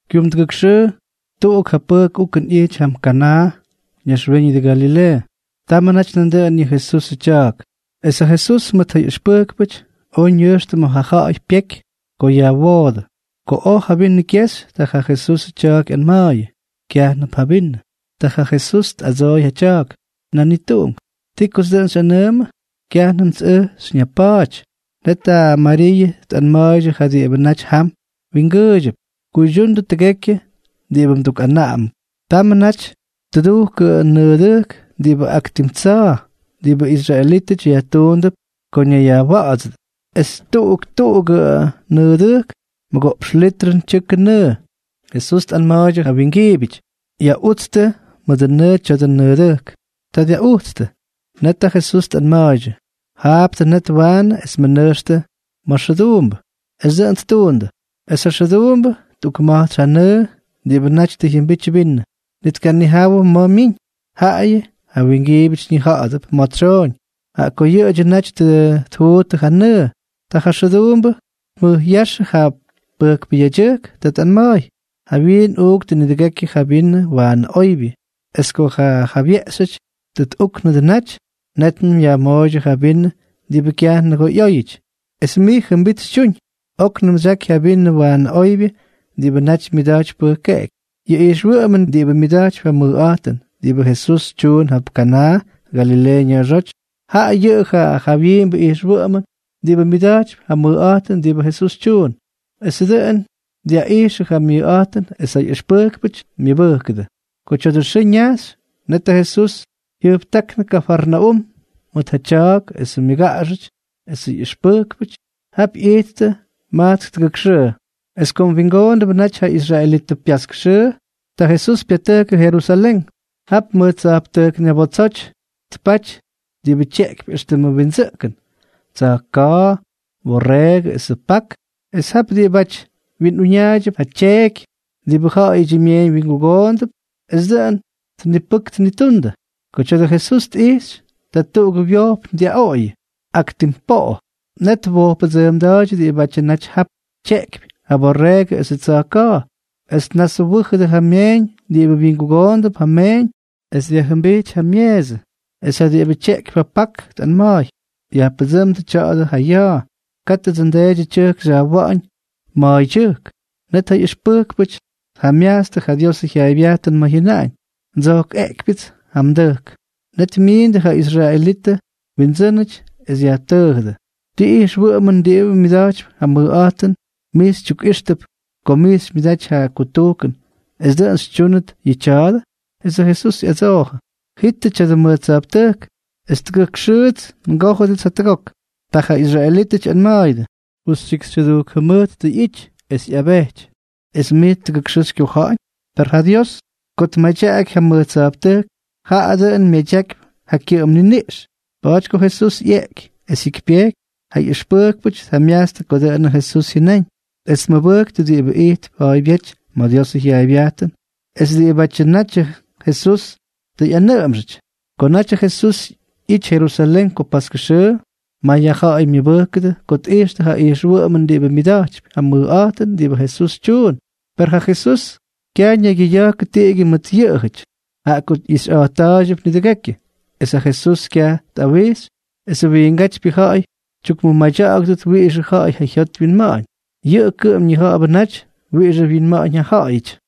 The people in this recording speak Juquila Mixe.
Kyumdʉgʉk xʉʉ tuꞌuk ja pʉjk ukʉn ꞌyity jam Kanaa, ñaxwíñʉdʉ Galileeʉ. Tamʉ naty nandʉꞌʉn yʉ Jesusʉ tya̱a̱k. Es ja Jesús mʉt ja ꞌyʉxpʉjkpʉty oj ñʉjxtʉ ma̱ ja ja̱ꞌa̱y pyeky ko yajwoodʉ. Ko oj ja vinʉ kyexy, ta ja Jesusʉ tya̱a̱k ꞌyanma̱a̱yʉ: —Kyajnʉp ja vinʉ. Ta ja Jesús tꞌadsooy ja tya̱a̱k: —Nanituꞌunk, ¿ti kots dʉꞌʉn xyꞌanʉʉmʉ? Kyajnʉmts ʉj xyñapa̱a̱ty. Net ja Mariiʉ tꞌanma̱a̱ydyʉ ja diꞌibʉ naty jam wingʉʉydyʉp: —Kuydyundʉ tʉgekyʉ diꞌibʉ mdukꞌanaꞌamʉp. Tamʉ naty tʉdujkʉ nʉʉdʉjk diꞌibʉ ak tim tsa̱a̱, diꞌibʉ israelítʉty yajtuundʉp ko ñayyajwa̱ꞌa̱dsʉdʉ. Es tuꞌuk tuꞌugʉ nʉʉdʉjk mʉgoꞌpx litrʉn tyʉkʉ nʉʉ. Jesús tꞌanma̱a̱ydyʉ ja wingiibyʉty: —Yaꞌutstʉ mʉdʉ nʉʉ tya̱dʉ nʉʉdʉjk. Ta dyaꞌujtstʉ. Net ja Jesús tꞌanma̱a̱ydyʉ: —Jaaptʉ net waanʉ es mʉnʉjxtʉ ma̱ xʉduumbʉ. Es dʉꞌʉn ttuundʉ. Es ja xʉduumbʉ tꞌukma̱jtsy ja nʉʉ diꞌibʉ naty tʉ jyʉmbity vinʉ. Ni tkanijawʉ ma̱ myiñ, jaꞌayʉ ja wingiibyʉty ñija̱ꞌa̱dʉp ma̱ tsyooñ, jaꞌa ko yʉꞌʉdyʉ naty tʉ tjuuttʉ ja nʉʉ. Ta ja xʉduumbʉ tmʉjꞌyáxʉ ja pʉjkpʉ yedyʉjk. Ta tꞌanma̱a̱y: —Jawyiin tꞌuuktʉ nidʉgekyʉ ja vinʉ waanʉ oybyʉ, es ko ja jabyeꞌxyʉty tʉ tꞌúknʉdʉ naty, nétnʉm yajmooydyʉ ja vinʉ diꞌibʉ kyaj nʉgoo ꞌyóyʉty. Es mij jʉmbit xytyuñ. Oknʉm xyaky ja vinʉ waanʉ oybyʉ diꞌibʉ naty myaꞌijtypy pʉjkeꞌeky. Yʉ ijxwʉꞌʉmʉn diꞌibʉ myʉda̱jtypy ja mʉjꞌa̱jtʉn diꞌibʉ Jesús tyuun jap Kanaa, Galileeʉ ña̱a̱xóty, jaꞌa yʉꞌʉ ja jawyiimbʉ ijxwʉꞌʉmʉn diꞌibʉ myʉda̱jtypy ja mʉjꞌa̱jtʉn diꞌibʉ Jesús tyuun. Esʉ dʉꞌʉn dyaꞌijxʉ ja myʉjꞌa̱jtʉn es ja ꞌyʉxpʉjkpʉty myʉbʉjkʉdʉ. Ko tya̱dʉ xʉʉ ñajxy, net ja Jesús jyʉjptáknʉ Kafarnaúm mʉt ja tya̱a̱k esʉ myʉgaꞌaxʉty esʉ ꞌyʉxpʉjkpʉty. Jap ꞌyijttʉ majtsk tʉgʉk xʉʉ. Es kom wingoombʉ naty ja israelitʉ pyaskʉ xʉʉ, ta Jesús pyatʉjkʉ Jerusalén. Jap mʉj tsa̱jptʉjk ñabotsoty tpaty diꞌibʉ tyeꞌkypy éxtʉmʉ windsʉꞌkʉn: tsa̱jka̱a̱, borreegʉ esʉ pak, es jap diꞌibáty wyinꞌuñaaydyʉp ja tyeeky diꞌibʉ ja̱ꞌa̱yʉdyʉ myeeñ wyingugoonʉdʉp es dʉꞌʉn tnipʉk tnitundʉ. Ko tya̱dʉ Jesús tꞌijxy, ta tuꞌugʉ wyojpn dyaꞌoꞌoyʉ ak tim poꞌo. Net twojppʉdsʉʉmda̱a̱ydyʉ diꞌibátyʉ naty jap tyeꞌkypy ja borreegʉ esʉ tsa̱jka̱a̱. Es tnaswʉ́jʉdʉ ja myeeñ diꞌibʉ wyingugoondʉp ja meeñ es dyajjʉmbijty ja myeesʉ. Es ja diꞌibʉ tyeꞌkypy ja pak tꞌanma̱a̱y: —¡Yajpʉdsʉ́mdʉ tya̱a̱dʉ ja ya̱a̱! ¡Kátʉdsʉ nDeedyʉ tyʉjk xyajwa̱ꞌa̱ñ ma̱a̱ydyʉjk! Net ja ꞌyʉxpʉjkpʉty tjamyajtstʉ ja Diosʉ jyaaybyajtʉn ma̱ jyʉnaꞌañ: “Ndsojkꞌeꞌkypyʉts ja mdʉjk.” Net myiindʉ ja israelitʉ wyindsʉ́nʉty es yajtʉʉjʉdʉ: —¿Ti ijxwʉꞌʉmʉn diꞌibʉ myʉda̱jtypy ja mʉjꞌa̱jtʉn mij xytyukꞌijxtʉp ko mij xymyʉdaty ja kutujkʉn es dʉꞌʉn xytyúnʉt yʉ tya̱a̱dʉ? Esʉ Jesús ꞌyadsoojʉ: —Jitʉ tya̱dʉ mʉj tsa̱jptʉjk, es tʉgʉk xʉʉts ngójʉdʉts jatʉgok. Ta ja israelítʉty ꞌyanma̱a̱yʉdʉ: —Justyikxytyʉdujk jʉmʉjt ꞌyity es ꞌyabejty, ¿es mij tʉgʉk xʉʉ xykyoja̱ꞌa̱ñ? Per ja Jesús ko tmadyaky ja mʉj tsa̱jptʉjk, jaꞌa dʉꞌʉn myadyakypy ja kyʉꞌʉm niniꞌx. Pa̱a̱ty ko Jesús ꞌyeꞌky es jyikypyejky, ja ꞌyʉxpʉjkpʉty tjamyajtstʉ ko dʉꞌʉn Jesús jyʉnáñ, es tmʉbʉjktʉ diꞌibʉ ijtp ja̱a̱ybyéty ma̱ Diosʉ jyaaybyajtʉn es diꞌibátyʉ natyʉ Jesús tʉ ꞌyanʉꞌʉmxʉty. Ko naty ja Jesús ꞌyity Jerusalén ko paskʉ xʉʉ, may ja ja̱ꞌa̱y myʉbʉjkʉdʉ ko tꞌijxtʉ ja ijxwʉꞌʉmʉn diꞌibʉ myʉda̱jtypy ja mʉjꞌa̱jtʉn diꞌibʉ Jesús tyuun. Per ja Jesús kyaj ñaygyʉya̱jkʉ tiꞌigyʉ mʉt yʉꞌʉjʉty, jaꞌa ko ꞌyixyꞌa̱jtta̱a̱ydyʉp nidʉgekyʉ. Es ja Jesús kyaj tꞌawijxy esʉ wiingátypyʉ ja̱ꞌa̱y tyukmʉmadya̱ꞌa̱gʉdʉt wiꞌixʉ ja̱ꞌa̱y ja jyot wyinma̱ꞌa̱ñ, yʉꞌʉ kʉꞌʉm ñija̱ꞌa̱bʉ naty wiꞌixʉ wyinma̱ꞌa̱ñ ja ja̱ꞌa̱yʉty.